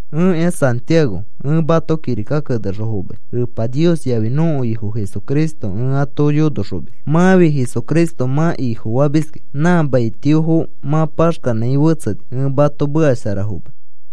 Ẽkĩa Santiago ẽ mato kirika kenexõ fomai. Epa Nios yafi nõko Ifo Jesucristo ẽ ato yonoxomis. Mãfi Jesucristo mã Ifofamiskĩ nã maitiofo mã paxkanãi fetseni. Ẽ mato meka shara fomai.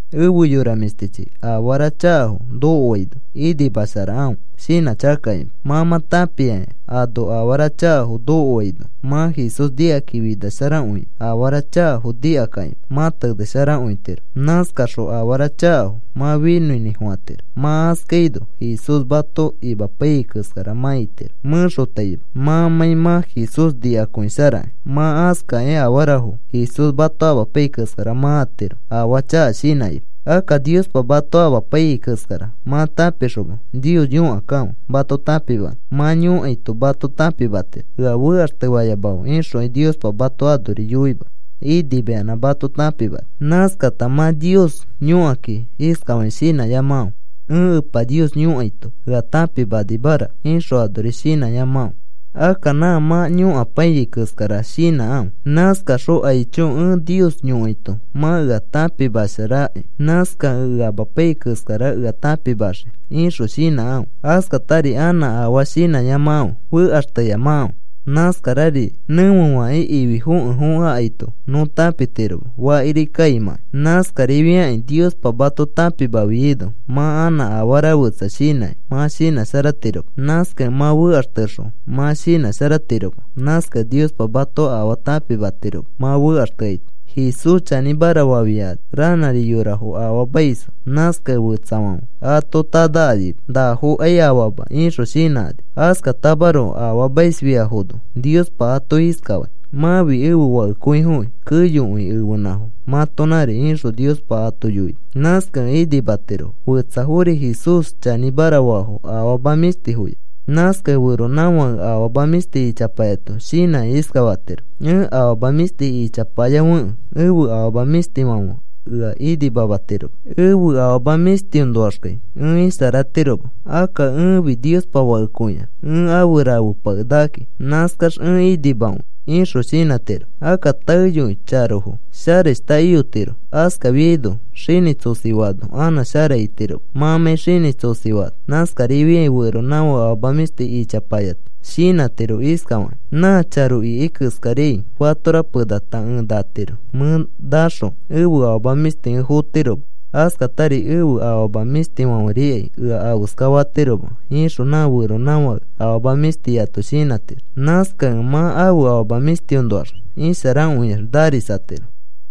Efe yora mĩshtichi, afara chakafo nokoaino, inimasharakãfe, shinãchakakakima. Mã mã tãpiakĩ, ano afara chakafo nokoaino, mã Jesús nikakĩ finasharakõikĩ, afara chakafo nikakãkima mã tenesharakõitiro. Nãskaxõ afara chakafo mã finõinĩfofãtiro. Mã askaino Jesús mato imapaiyai keskara mã itiro mẽxotaima mãmãi mã Jesús nikakõisharakĩ. Mã askakĩ afarafo Jesús mato amapaiyai keskara mã atiro afaa chaka shinãkima. Akka Niospa mato amapaiyai keskara mã tãpixoma, Nios yõkakãfe mato tãpimanõ. Mã yõkaito mato tãpimatiro. “Ea fekaxtefayamakãfe,” ixokai Niospa mato anori yoima. Inimayanã mato tãpimani. Nãskata mã Nios yõkakĩ iskafakĩ shinãyamakãfe: “Ẽ Epa Nios yõkaito ea tãpimanimaraka,” ixõ anori shinãyamakãfe. Akka nã mã yõkapaiyai keskara shinãkãfe. Nãskaxõ, “Aicho, ẽ Nios yõkaito mã ea tãpimasharaki. Nãskakẽ ea amapaiyai keskara ea tãpimaxii,” ixõ shinãkãfe. Askatari anã afaa shinãyamakãfe. Fekaxteyamakãfe. Nãskarari nẽfefakĩ ifi fokẽ fokẽ akaito nõ tãpitiroma fakiri kaimãkai. Nãskarifiakĩ Niospa mato tãpimafiaino mã anã afara fetsa shinãkĩ mã shinãsharatiroma. Nãskakẽ mã fekaxtexõ mã shinãsharatiroma. Nãskakẽ Niospa mato afaa tãpimatiroma mã fekaxteaito. Jesús chanĩmara fafiakani ranãri yorafo afaamaisfo. Nãskakẽ fetsafãfe ato tanakanima. “Nafokai afama,” ixõ shinãkani. Askatamaroko afaamaisfiafono Niospa ato iskafai: “Mãfi ẽfe fakekõifokĩ. Keyokõi ẽfenãfo mãtonãri,” ixõ Niospa ato yoini. Nãskakẽ inimatirofo. Fetsafori Jesús chanĩmara faafo afama mĩshtiyafo. Nãskakẽ feronãfake afama mĩshti ichapayato shinãkĩ iskafatiro: “Ẽ afama mĩshti ichapayafekẽ ẽfe afama mĩshtifãfe ea inimamatiroma. Ẽfe afama mĩshtiõnoaxkai ẽ isharatiroma. Akka ẽfi Niospa fakekõiax, ẽ afe rafepakenakakĩ. Nãskax ẽ inimakõi,” ixõ shinãtiro. Akka taeyoi charofo sharashta iyotiro. Askafiaino xinĩ tsosifaano, anã shara itiroma mãmãi xinĩ tsosifaano. Nãskarifiai feronãfake afama mĩshti ichapayato shinãtiro iskafakĩ: “Nã charo ikai keskariai fatora penata ẽ natiro. Mẽ nãxõ ẽfe afama mĩshti ẽ fotiroma. Askatari ẽfe afama mĩshtifãferikai ea afeska fatiroma,” ixõ nã feronãfãke afama mĩshtiyato shinãtiro. Nãskakẽ mã ãfe afama mĩshtifoõnoax isharakõiax narisatiro.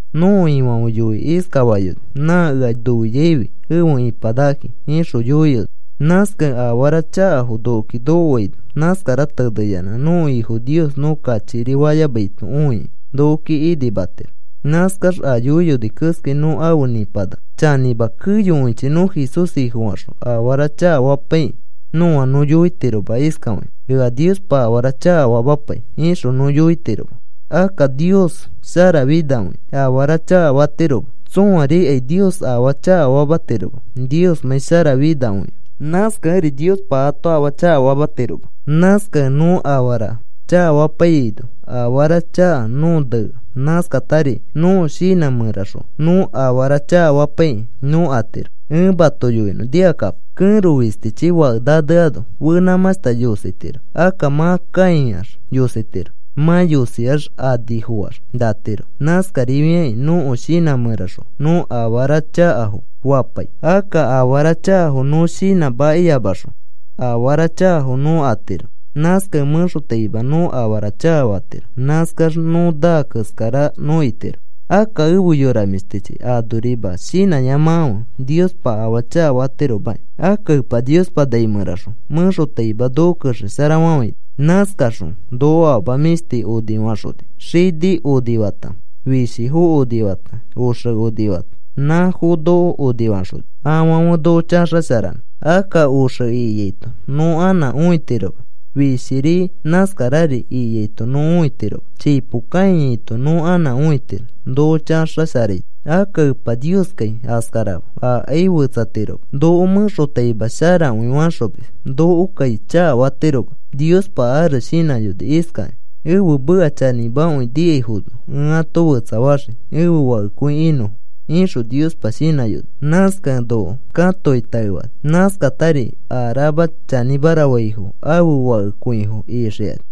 Nõko Ifãfe yoikĩ iskafayoni: “Nã ea noiaifi efe ĩpanakakĩ,” ixõ yoiyoni. Nãskakẽ afara chakafo nokoki nokoaino, nãskara teneyanã nõko Ifo Nios nõ kachikiri fayamaito õikĩ nokoki inimatiro. Nãskax a yoiyoni keskai nõ afe nĩpanaka. Chanĩma, keyokõichi nõ Jesús Ifofaxõ afara chakafapaikĩ nõa nõ yoitiroma iskafakĩ: “Ea Niospa afara chakafamapai,” ixõ nõ yoitiroma. Akka Nios sharafinakõia. Afara chakafatiroma. Tsõarikai Nios afaa chakafamatiroma, Niosmãi sharafinakõikẽ. Nãskakẽri Niospa ato afaa chakafamatiroma. Nãskakẽ nõ afara chakafapaiyaino afara chaka nõo nea. Nãskatari nõko shinã mẽraxõ nõ afara chakafapaikĩ nõ atiro. Ẽ mato yoinõ, nikakapo. Kẽro fistichi fake naneano fenãmãshta yositiro. Akka mã kãiax yositiro. Mã yosiax anifoax, natiro. Nãskarifiakĩ nõko shinã mẽraxõ nõ afara chakafo fapai, akka afara chakafo nõ shinãmakiyamaxõ, afara chakafo nõ atiro. Nãskakẽ mẽxotaima nõ afara chakafatiro. Nãskax nõ naa keskara nõ itiro. Akka efe yora mĩshtichi, anorima shinãyamakãfe. Niospa afaa chakafatiromaki. Akka Epa Niospa nai mẽraxõ mẽxotaima noko kexesharafafãini. Nãskaxõ noko afama mĩshti onifaxoni. Xini onifata, fishifo onifata, oxe onifata, nãfo noko onifaxoni, afãfe noko chaxasharanõ. Akka oxe ikiaito nõ anã õitiroma. Fishiri nãskarari ikiaito nõ õitiroma. Chipo kãiyaito nõ anã õitiro noko chaxasharaito. Akka Epa Nioskai askarama. Akai fetsatiroma. Noko mẽxotaima sharakõi faxomis. Nokokai chakafatiroma. Niospa ares shinãyoni iskakĩ: “Ẽfe meka chanĩmakõi nikaifono ẽ ato fetsafaxii ẽfe fakekõi inõfo,” ixõ Niospa shinãyoni. Nãskakẽ noko katokĩ taefani. Nãskatari a rama chanĩmara faifo ãfe fakekõifo ixikani.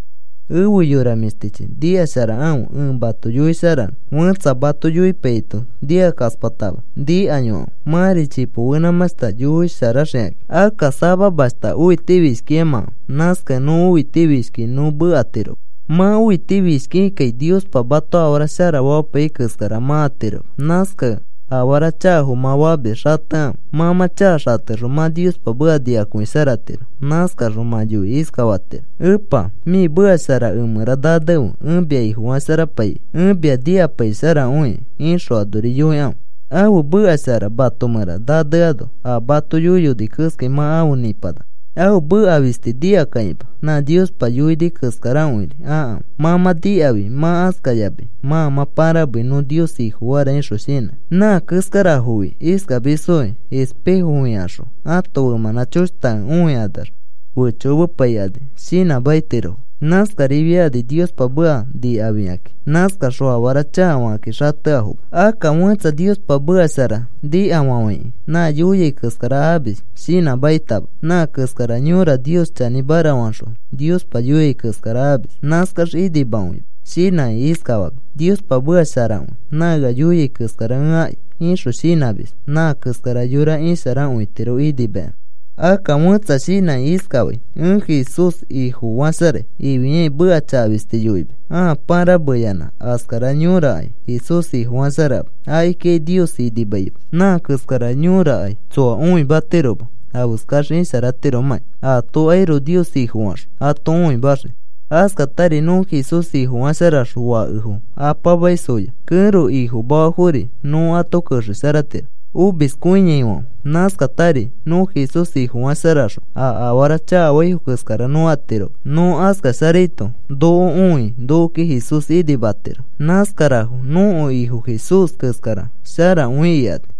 Efe yora mĩshtichi, nikasharakãfe ẽ mato yoisharanõ. Fẽtsa mato yoipaiyaito, nikakaspatama nikayokãfe. Mãri chipo fenãmãshta yoisharaxikakĩ. Akka samamashta õitifishkiyamakãfe. Nãskakẽ nõ õitifishkiki nõ mekatiroma. Mã õitifishkikikai Niospa mato afara sharafamapaiyai keskara mã atiroma. Nãskakẽ afara chakafo mã famis xatekãfe. Mã mã chaka xatexõ mã Niospa meka nikakõisharatiro. Nãskaxõ mã yoikĩ iskafatiro: “Epa, mĩ meka shara emẽra nanefe ẽ mia Ifofasharapaikai. Ẽ mia nikapaisharakõikai,” ixõ anori yoikãfe. Ãfe meka shara mato mẽra naneano, a mato yoiyoni keskai mã afe nĩpanaka. Ãfe meka fisti nikakãkima nã Niospa yoini keskakõiri akãfe. Mã mã nikafi mã askayamai mãa mã pãramei, “Nõ Nios Ifofara,” ixõ shinãkĩ. Nã keskarafofi iskamisfokĩ: Espejo fikaxõ ãto femãnã choshtakẽ õikanax fechokomepaikani shinãmakitirofo. Nãskarifiakani Niospa meka nikafikakĩ, nãskakaxõ afara chakafakakĩ xateafoma. Akka fẽtsa Niospa meka shara nikafafãikĩ nã yoiai keskara amis, shinãmakitama. Nã keskara yõra Nios chanĩmara faxõ Niospa yoiai keskara amis, nãskax inimakõimis. Shinãkĩ iskafamis: “Niospa meka sharakõi. Nã ea yoiai keskara ẽ aki,” ixõ shinãmis. Nã keskara yora isharakõitiro inimayanã. Akka fẽtsa shinãkĩ iskafai: “Ẽ Jesús Ifofasharai,” ifiakĩ meka chaka fisti yoimis ãa pãrameyanã. Askara yõrakai Jesús Ifofasharama. Akikikai Nios inimaima. Nã keskara yõrakai tsoa õimatiroma afeskax isharatiromãki. Atokairoko Nios Ifofaxõ ato õimaxiki. Askatari nõ Jesús Ifofasharaxõ fakefo apamaisfoya, kẽro ifomafafori nõ ato kexesharatiro, omiskõiaifãfe. Nãskatari nõ Jesús Ifofasharaxõ a afara chakafaifo keskara nõ atiroma. Nõ aska sharaito noko õi nokoki Jesús inimatiro. Nãskarafo nõko Ifo Jesús keskara sharakõi ikani.